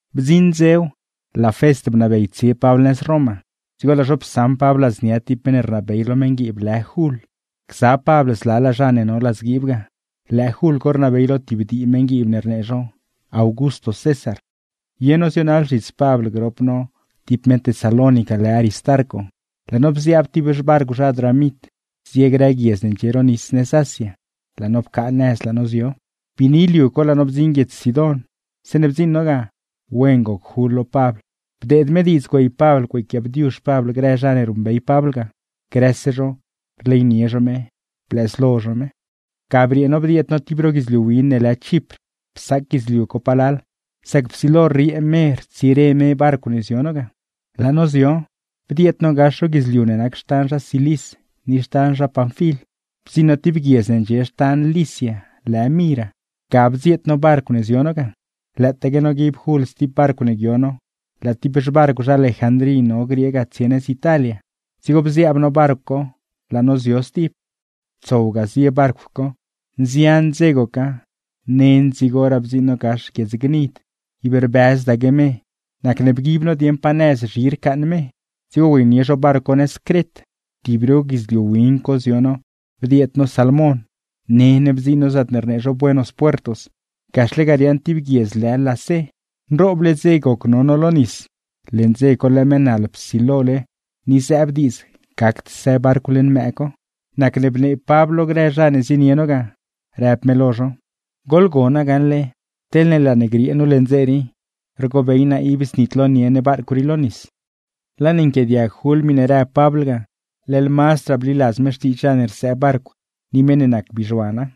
Bdziṉ dzew, laa Fest bnabey tsie Pabl nëz Roma, dzigo laa zho psaṉ Pabl ladznia ti meṉ ne rnabey lo meṉguiib lë Jul, gza Pabl zlalaa zha ne no ladzguiib ga. Lëë Jul co rnabey lo tib dii meṉguiib ne rnee zho “Augusto César”. Ye no zionaḻ zhits Pabl grop no Aristarco, laa no bziaab ti xbarcw zha Adramit zie grë guiedz ne ndxie ro nis nëz Asia, laa no pcaa nëz laa no zio. Biini liu co laa no bdziṉ guiedz Sidón. Zeeṉe bdziṉ no ga, wen goc Jul lo Pabl bdeed me diidz güey Pabl güeyquiaabdiuzh Pabl grë zha ne ruṉbey Pabl ga, grëse zho rleynie zho me blëzlo zho me. Ga briee no bdieed no tib ro guidzliu win ne lë Chipr, psaac guidzliu co palal, sac psilo rriee me rtsire me barcw ne zio no ga. Laa no zio, bdieed no gax ro guidzliu ne nac xtan zha Cilis ni xtan zha Panfil, bdziṉ no ti guiedz ne ndxie xtan Licia lë Mira; ga bdzieet no barcw ne zio no ga. Lëëtaaque noguib Jul sti barcw ne guio no, laa ti xbarcw zha Alejandrí no griee ga tsie nëz Italia, dzigo bziaab no barcw co laa no zio stib. Tsow ga zie barcw co, nzian dze goca, nen dzigoraa bdziṉ no gax guiedz Gnid; ib rbëzdaque me, nacne bguib zho dieṉ pa nëz zhi rcaaṉ me, dzigo güeynie zho barcw co nëz Cret. Tib ro guidzliu win co zio no bdieed no Salmon; nen bdziṉ no zaatne rnee zho Buenos Puertos, gaxle ga riaaṉ ti guiedz lë Lasé. Nrooble dze goc no no lo nis, leṉ dze co laa mëë naḻ psilole ni zëëb diidz gacd së barcw leṉ mëë co, nacne bnee Pabl lo grë zha ne zienie no ga, rëb me lo zho: ―Goḻgona gaṉle, teḻne laa ne griee nu leṉ dze rii, rgobey naa ib znitlonie ne barcw rii lo nis. Laa ne niacnie Jul Pabl niac miṉe rëb Pabl ga, leḻ mazdraa bliladz me xtiidz zha ne rsëë barcw ni meṉ ne nac bizhuana.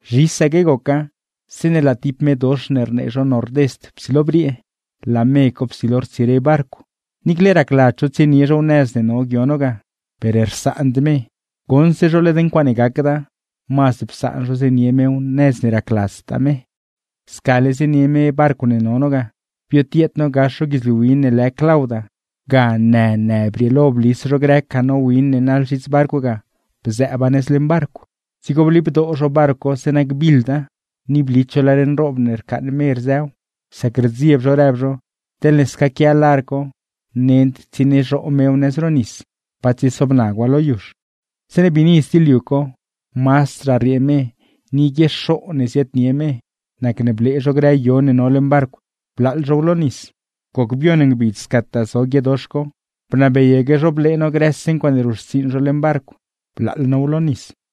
Zhisaque goca zeeṉe laa ti me dox ne rnee zho Nordest psilo briee, laa me co psilo rtsire barcw. Niicle racladz zho tsienie zhow nëz ne no guio no ga, per rsaand me; goṉse zho led ncuaaṉe gacda, mazd psaan zho zienie mew nëz ne racladztaa me. Scale zienie me barcw ne no no ga, biotieed no gax ro guidzliu win ne lë Clauda, ga në në brieelo blis zho grë canó win ne naḻ zhits barcw ga bzëëba nëz leṉ barcw; dzigo blibdoo zho barcw co zeeṉa gbiḻda, ni blit zho lar nroob ne rcaaṉ me rzëw, sac rdzieb zho rëb zho teḻne scaquia lar co nend tsieniezhoo mew nëz ro nis, pa tsiesobnagwa lo yuzh. Zeeṉe biini sti liu co mazdraa rriee me, ni guiexoo ne ziaadnie me, nacne blee zho grë yo ne no leṉ barcw blaaḻ zhow lo nis. Goc bioṉ ngbidz scataa zo guie dox co, bnabeyaque zho blee no grëse ncuaaṉe ruṉxtsiiṉ zho leṉ barcw blaaḻ now lo nis.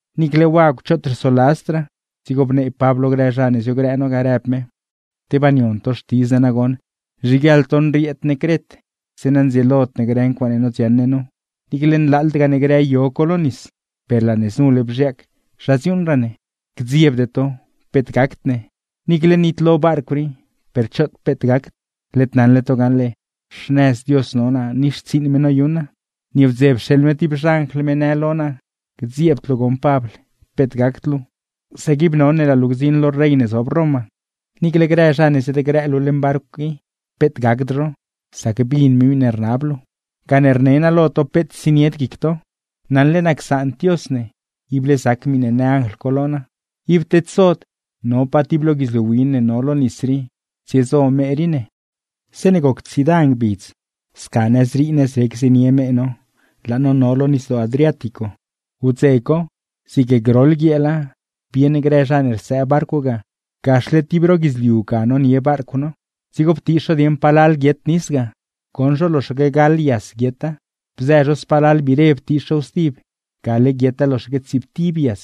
Niicle wagw choot rsoladzdraa, dzigo bnee Pabl lo grë zha ne ziogrë no ga, rëb me: ―Tebaa nion to xtidz naa nagoṉ nzhiguieḻ to nrieed ne Cret, zeeṉa ndzieelod ne grë ncuaaṉe nodziaṉ ne nu, niicle nlaaḻdgaa ne grë yo co lo nis. Per laa ne znule bzhiaac zha dziuuṉraa ne. ¡Gdziebde to! ¡Peet gacd ne! Niicle nitlo barcw rii, per choot peet gacd. Led naṉle to gaṉle, xnëz Dios no naa ni xtsiiṉ me noyuṉ naa, nieewdze pxeeḻ me ti xanjl me në lo naa: “Gdziebd luu goṉ Pabl, peet gacd luu, sac ib none laa luu gdziṉ lo rey ne zob Roma. Niicle grë zha ne ziadgrëë luu leṉ barcw i peet gacd zho, sac bin me miṉe rnab luu.” Gane rne naa lo to peet tsienied guic to, naṉle naa csaand Dios ne, ible zac miṉe në anjl co lo naa. Ib tedsod, no pa ti lo guidzliu win ne no lo nis rii tsiezo me rii ne. Zeeṉe goc tsiida ngbidz sca nëzrii nëzrec zienie me no, laa no no lo Nisdoo Adriático. Wdze co, zig groḻ guieela, bieṉ grë zha ne rsëë barcw ga gaxle ti ro guidzliu ga nonie barcw no; dzigo ptiix zho dieṉ palal guiet nis ga, goṉ zho loxaque gaḻ yas guieta. Bzë zho spalal biire ptiix zhow stib, gale guieta loxaque tsiiptib yas.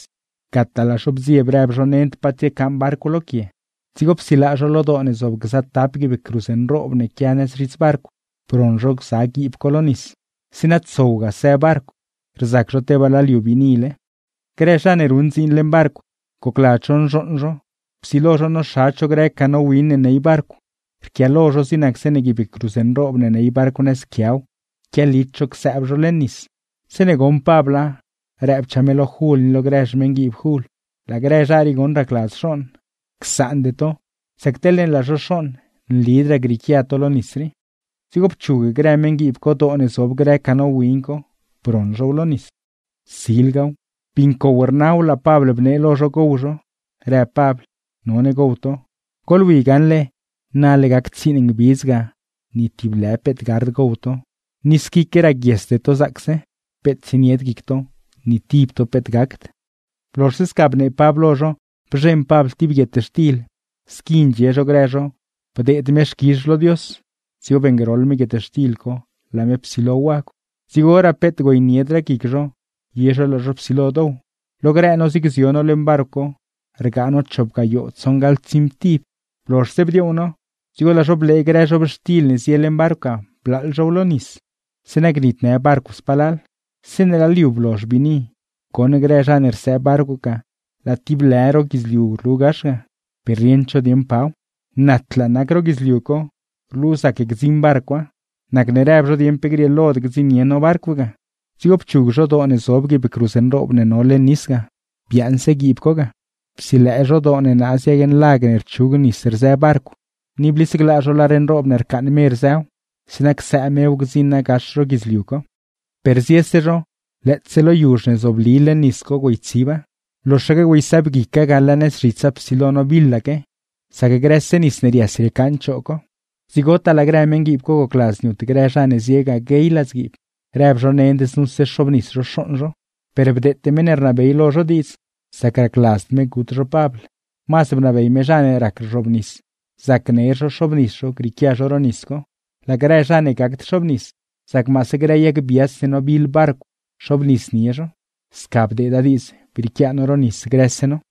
Gataa laa zho bdzieb rëb zho nend pa tsiecaaṉ barcw lo quie, dzigo psilëë zho lo doo ne zob gza tap guiib cruz nroob ne quia nëz zhits barcw, broṉ zho gza guiib co lo nis, zeeṉa tsowga së barcw; rzac zho tebaa laa liu biinile. Grë zha ne ruṉ dziin leṉ barcw, gocladz zho nzhooṉ zho, psilo zho noxadz zho grë canó win ne ney barcw, rquiaalo zho zig nac zeeṉe guiib cruz nroob ne ney barcw nëz quiaw quialit zho csëëb zho leṉ nis. Zeeṉe goṉ Pabla, rëbchaa me lo Jul ni lo grë xmeṉguiib Jul: ―¡Laa grë zha rii goṉ racladz xooṉ! Csaande to, sac teḻne laa zho xooṉ nlidraa grieequia to lo nis rii. Dzigo pchug grë meṉguiib co doo ne zob grë canó win co, broṉ zhow lo nis. Silgaw, bii ncow rnaw laa Pabl bnee lo zho gow zho, rëb Pabl: ―¡None gow to! Goḻwi gaṉle nale gac tsiiṉ ngbidz ga ni ti lë peet gard gow to, ni squique raguiesde to zaacse. Peet tsienied guic to, ni tib to peet gacd. Blozhse sca bnee Pabl lo zho, bzheṉ Pabl ti guietxtil, squi ndxie zho grë zho bdeed me xquizh lo Dios, dzigo beeṉgroḻ me guietxtil co laa me psilo wagw. Dzigoraa peet güeyniedraa guic zho, ye zho laa zho psilo dow. Lo grë no zig zio no leṉ barcw co rgaa no chop gayoo tsoṉgaḻtsiimtib. Blozhse bdioow no, dzigo laa zho blee grë zhobxtil ne zie leṉ barcw ga blaaḻ zhow lo nis, zeeṉa gnitnë barcw spalal. Zeeṉe laa liu blozh biini, goṉ grë zha ne rsëë barcw ga laa ti lë ro guidzliu rlu gax ga, per rieṉd zho dieṉ paw. Natlaa nac ro guidzliu co, rlu zac gdziṉ barcwa, nacne rëb zho dieṉ pe grieelod gdziṉnie zho barcw ga. Dzigo pchug zho doo ne zob guiib cruz nroob ne no leṉ nis ga, biaaṉse guiib co ga. Psilëë zho doo ne naaz yag nlag ne rchug nis rzë barcw, ni blisglaa zho lar nroob ne rcaaṉ me rzëw; zeeṉa csëë mew gdziṉa gax ro guidzliu co. Per ziese zho, lëëtse lo yuzh ne zobli leṉ nis co güeytsiba, loxaque güeysëëbguica ga laa nëz zhitsa psilo nobiḻaque, sac grëse nis ne rias riecaaṉ choo co. Dzigotaa laa grë meṉguiib co gocladz niut grë zha ne zie ga guey ladzguiib, rëb zho nend znuse xoobnis zho xooṉ zho. Per bdeete meṉ ne rnabey lo zho diidz, sac racladzd me gut zho Pabl. Mazd bnabey me zha ne rac rzhoobnis, zac ner zho xoobnis zho grieequia zho ro nis co; laa grë zha ne gacd xoobnis, zac maase grë yag biats ne nobiḻ barcw xoobnisnie zho. Sca bdeeda diidz brieequia no ro nis grëse no.